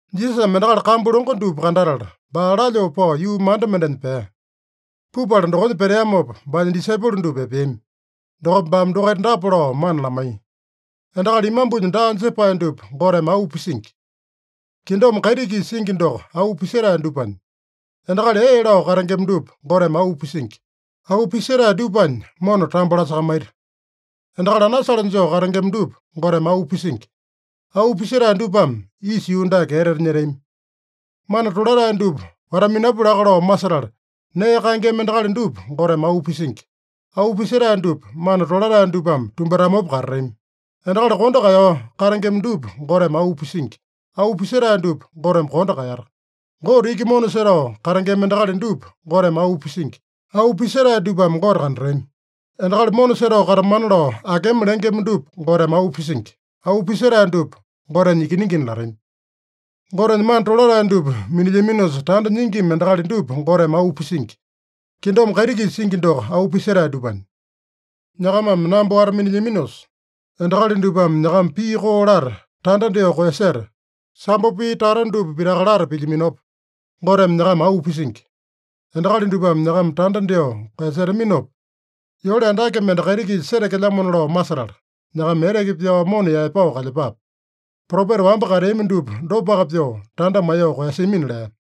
Jisasame endakali kambu longo dupa kandatala, baa lalyoo pao yuu manda mendenya pea. Pupala dokonya peteamopa, baanya disaipolo dupa epeami. Dokopa baame dokaita dapa lao mana lamaiya: “Endakali imambunya daa jepae dupa Goteme auu pisingi. Kingdom kaiti-kisa singi doko auu pisetae dupanya. “Endakali ee lao katengema dupa Goteme auu pisingi. Auu pisetae dupanya mona tambo lasakamaita. “Endakali anasale joo katengema dupa Goteme auu pisingi. Auu pisetae dupame isa yuu dake etete nyetami. “Mana tolatae dupa wata-minapu laka lao masetala, nee kaengema endakali dupa Goteme auu pisingi. Auu pisetae dupa mana tolatae dupame tumbatamopa katatami. “Endakali kondo kaeyao katengema dupa Goteme auu pisingi. Auu pisetae dupa Goteme kondo kaeyata. “Gote iki mona setao katengema endakali dupa Goteme auu pisingi. Auu pisetae dupame Gote kandatami. “Endakali mona setao katamana lao akema lengema dupa Goteme auu pisingi. Auu pisetae dupa Gotenya ikiningina latami. “Gotenya mana tolatae dupa minilyaminosa tanda nyingima endakali dupa Goteme auu pisingi. Kingdom kaiti-kisa singi doko auu pisetae dupanya. “Nyakamame namba wata-minilyaminosa, endakali dupame nyakama pii koo lata, tanda dyoo koeyaseta, sambo pii tata dupa pitaka lata pilyaminopa, Goteme nyakama auu pisingi. Endakali dupame nyakama tanda dyoo koeyasetaminopa, yole andake mende kaiti-kisa setekelyamona lao masetala, nyakama eteke pyao mona yaepao kalyepape. Propeta wamba kateami dupa dopaka pyoo tanda maiyoo koeyasiamina” lea.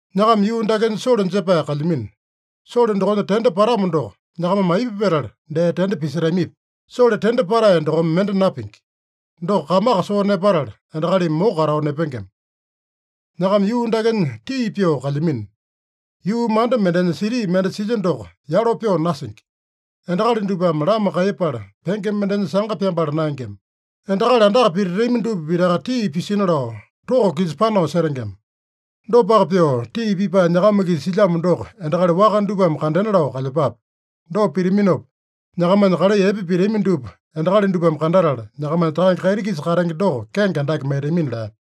“Nyakama yuu dakenya sole jepae kalyamino. Sole dokonya tende patamo doko, nyakamame aipa petala dee tende pisetamipi? Sole tende patae dokome mende napingi. Doko kamaka soo nepatala, endakalimi moko katao nepengema. “Nyakama yuu dakenya tii pyoo kalyamino. Yuu manda mendenya siti mende silya doko yalo pyoo nasingi. Endakali dupame lama kaiyepala, penge mendeme sanga pyambala naengema. Endakali andaka pititami dupa pitaka tii pisina lao toko-kisa panao setengema. Dopaka pyoo, tii pipae nyakama-kisa silyamo doko endakali waka dupame kandena lao kalyepape. Dopa pitaminopa, nyakamanya kalai epe pitami dupa endakali dupame kandatala, nyakamanya Takange kaiti-kisa katenge doko kenge andake maitamina” lea.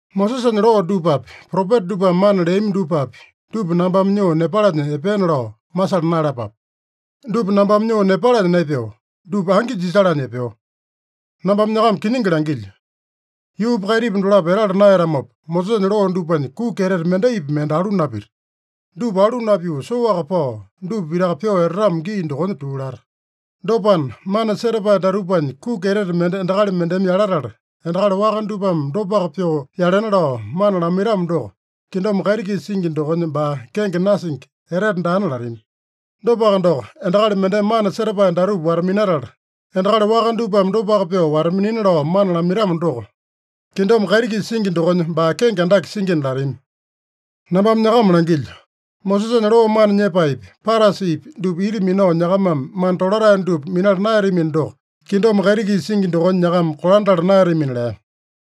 “Mosesanya loo dupapi, propeta dupame mana leami dupapi, dupa nambame nyoo nepalanya epeena lao masala naeyalapape. Dupa nambame nyoo nepalanya naepeo. Dupa angi jisalanya epeo. Nambame nyakama kiningi langilyo: Yuupa kaitipa dolapo etala naeyatamopa, Mosesanya loo dupanya kuki etete mendaipi mende alu napita. Dupa alu napyoo soaka pao, dupa pitaka pyoo etatamo gii dokonya tuu lata. Dopana, mana setapae datupanya kuki etete mende endakali mendeme yalatala, endakali waka dupame dopaka pyoo yalena lao mana lamaitamo doko, kingdom kaiti-kisa singi dokonya baa kenge nasingi, etete daana latami. Dopaka doko, endakali mendeme mana setapae datupa wata-minatala, endakali waka dupame dopaka pyoo wata-minina lao mana lamaitamo doko, kingdom kaiti-kisa singi dokonya baa kenge andake singina latami. Nambame nyakama langilyo: Mosesanya loo mana nyepaepi, Parasipi dupa ita minao nyakamame mana tolatae dupa minala naeyatamino doko, kingdom kaiti-kisa singi dokonya nyakama kolandala naeyatamina” lea.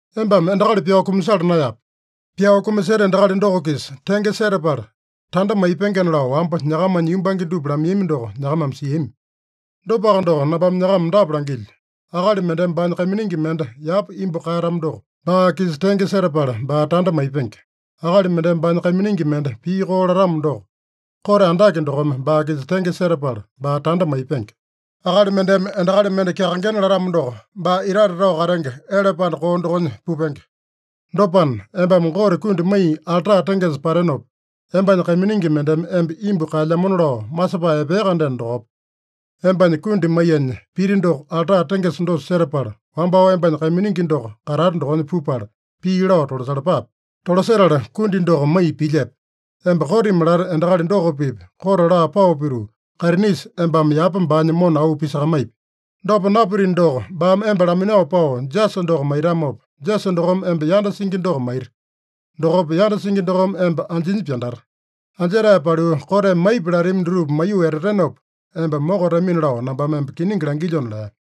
“ ‘Embame endakali pyao kumasala naeyape. Pyao kumaseta endakali doko-kisa tenge setapala tanda maipengena’ lao, wamba nyakamanya yumbange dupa lamaiyami doko nyakamame siami. Dopaka doko, nambame nyakama dapa langilyo: Akali mendeme baanya kaiminingi mende yapa imbu kaeyatamo doko, baa-kisa tenge setapala baa tanda maipenge. Akali mendeme baanya kaiminingi mende pii koo latamo doko, kote andake dokome baa-kisa tenge setapala baa tanda maipenge. Akali mendeme endakali mende kyakaengena latamo doko, baa itate tao katenge ele panda koo dokonya pupenge. Dopana, embame Gote kundi maiya alta tengesa patenopa, embanya kaiminingi mendeme emba imbu kaelyamona lao masepae epea-kandeno dokopa, embanya kundi maiyanya piti doko alta tengesa dosa setapala, wambao embanya kaiminingi doko katata dokonya pupala, pii lao tolasalapape. Tolasetala kundi doko maiya pilyepe. Emba kotimi lata endakali doko-pipa kote laa pao pituu, kaitinisa embame yapa baanya mona auu pisakamaipi. Dopa napitino doko, baame emba laminao pao jasa doko maitamopa, jasa dokome emba yanda singi doko maita. Dokopa yanda singi dokome emba anjinya pyandata. Anjetae paliu, koteme maipi latami dutupa maiyoo etatenopa, emba mokatamina lao nambame emba kiningi langilyona” lea.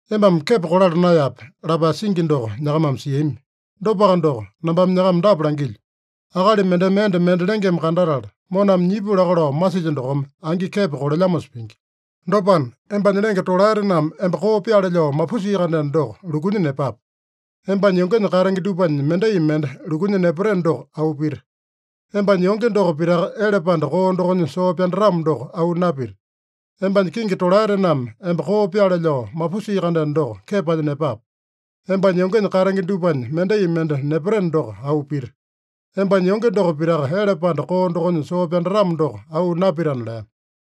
“ ‘Embame kepo kolala naeyape’ lapae singi doko nyakamame siami. Dopaka doko, nambame nyakama dapa langilyo: Akali mendeme enda mende lengeme kandatala, moname nyipu laka lao masilya dokome angi kepo kolelyamosa pingi. Dopana, embanya lenge tolaetename emba koo pyaale lao mapusia-kandeno doko, lukunya nepape. Embanya yongenya katenge dupanya mendai mende lukunya nepateno doko auu pita. Embanya yonge doko pitaka ele panda koo dokonya soo pyandatamo doko auu napita. Embanya kingi tolaetename emba koo pyaale lao mapusia-kandeno doko, kepanya nepape. Embanya yongenya katenge dupanya mendai mende nepateno doko auu pita. Embanya yonge doko pitaka ele panda koo dokonya soo pyandatamo doko auu napitana” lea.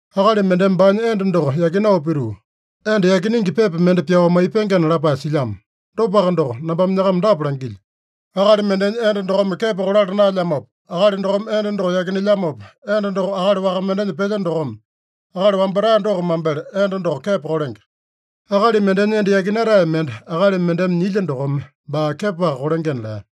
“ ‘Akali mendeme baanya enda doko yakinao pituu, enda yakinenge pepa mende pyao maipengena’ lapae silyamo. Dopaka doko, nambame nyakama dapa langilyo: Akali mendenya enda dokome kepo kolala naelyamopa, akali dokome enda doko yakinelyamopa, enda doko akali waka mendenya pelya dokome, akali wambatae doko mambele enda doko kepo kolenge. Akali mendenya enda yakinatae mende akali mendeme nyilya dokome baa kepoaka kolengena” lea.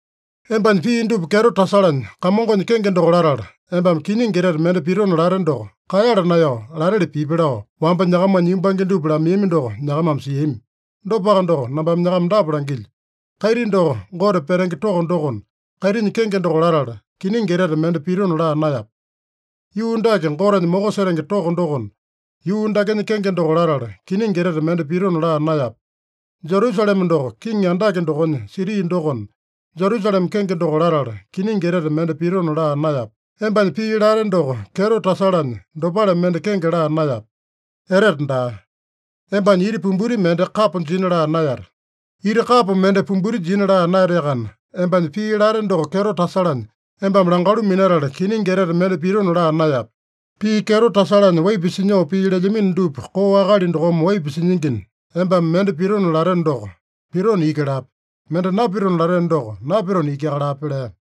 “ ‘Embanya pii dupa kyeto tasalanya, Kamongonya kenge doko latala, embame kiningi etete mende pitona late doko, kaeyala naeyao lateli pipi’ lao, wamba nyakamanya yumbange dupa lamaiyami doko nyakamame siami. Dopaka doko, nambame nyakama dapa langilyo: Kaiti doko Gote petenge toko dokona, kaitinya kenge doko latala, kiningi etete mende pitona laa naeyape. Yuu dake Gotenya moko setenge toko dokona, yuu dakenya kenge doko latala, kiningi etete mende pitona laa naeyape. Jerusalema doko Kiŋi Andake dokonya siti dokona, Jerusalema kenge doko latala, kiningi etete mende pitona laa naeyape. Embanya pii late doko kyeto tasalanya, dopale mende kenge laa naeyape. Etete daa. Embanya iti pumbuti mende kapo jina laa naeyate. Iti kapo mende pumbuti jina laa naeyateakana, embanya pii late doko kyeto tasalanya, embame langalu minatala kiningi etete mende pitona laa naeyape. Pii kyeto tasalanya waipa sinyoo pii lelyamino dupa koo akali dokome waipa sinyingina, embame mende pitona lateno doko, pitona iki lape. Mende napitona lateno doko, napitona ikiaka lape” lea.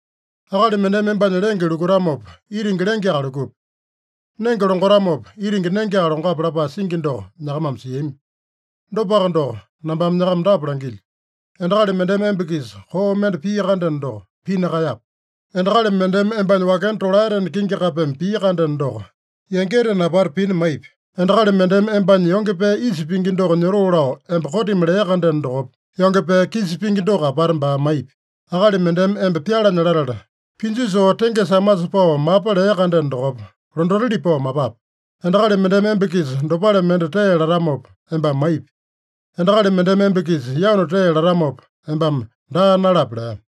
“ ‘Akali mendeme embanya lenge lukutamopa, itingi lengeaka lukupi. Nenge longatamopa, itingi nengeaka longape’ lapae singi doko nyakamame siami. Dopaka doko, nambame nyakama dapa langilyo: Endakali mendeme emba-kisa koo mende pia-kandeno doko, pina kaeyape. Endakali mendeme embanya wakena tolaetena kingi kapeme pia-kandeno doko, yangitena apata pina maipi. Endakali mendeme embanya yonge pee isa pingi doko nyotoo lao emba kotimi lea-kandeno dokopa, yonge pee kisa pingi doko apata baa maipi. Akali mendeme emba pyalanya latala, pinju soo tengesa amasa pao mapa lea-kandeno dokopa, londatili pao mapape. Endakali mendeme emba-kisa dopale mende tee latamopa, embame maipi. Endakali mendeme emba-kisa yanu tee latamopa, embame daa nalape” lea.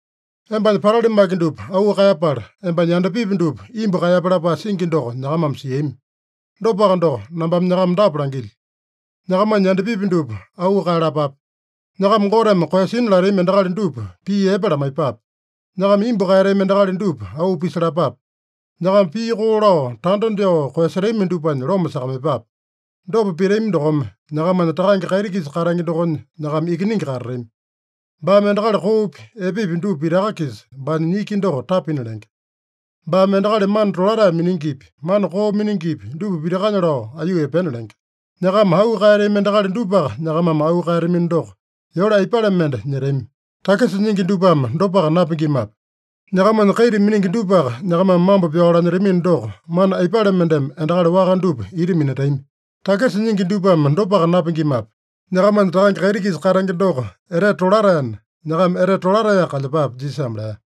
“ ‘Embanya patali maki dupa auu kaeyapala, embanya yandapipi dupa imbu kaeyape’ lapae singi doko nyakamame siami. Dopaka doko, nambame nyakama dapa langilyo: Nyakamanya yandapipi dupa auu kaeyalapape. Nyakama Goteme koeyasina latami endakali dupa pii epe lamaiyepape. Nyakama imbu kaeyatami endakali dupa auu pisalapape. Nyakama pii koo lao tanda dyoo koeyasetami dupanya loma sakamaiyepape. Dopa pitami dokome, nyakamanya Takange kaiti-kisa katenge dokonya nyakama ikiningi katatami. Baame endakali koopi, epepi dupa pitaka-kisa baanya niki doko tapina lenge. Baame endakali mana tolatae miningipi, mana koo miningipi dupa pitakanya lao aiyuu epena lenge. Nyakama auu kaeyatami endakali dupaka nyakamame auu kaeyatamino doko, yole aipale mende nyetami? Takisa nyingi dupame dopaka napingimape? Nyakamanya kaita miningi dupaka nyakamame mambo pyao lanyetamino doko, mana aipale mendeme endakali waka dupa ita minatami? Takisa nyingi dupame dopaka napingimape? Nyakamanya Takange kaiti-kisa katenge doko etete tolataena, nyakama etete tolataeyaka kalyepape” Jisasame lea.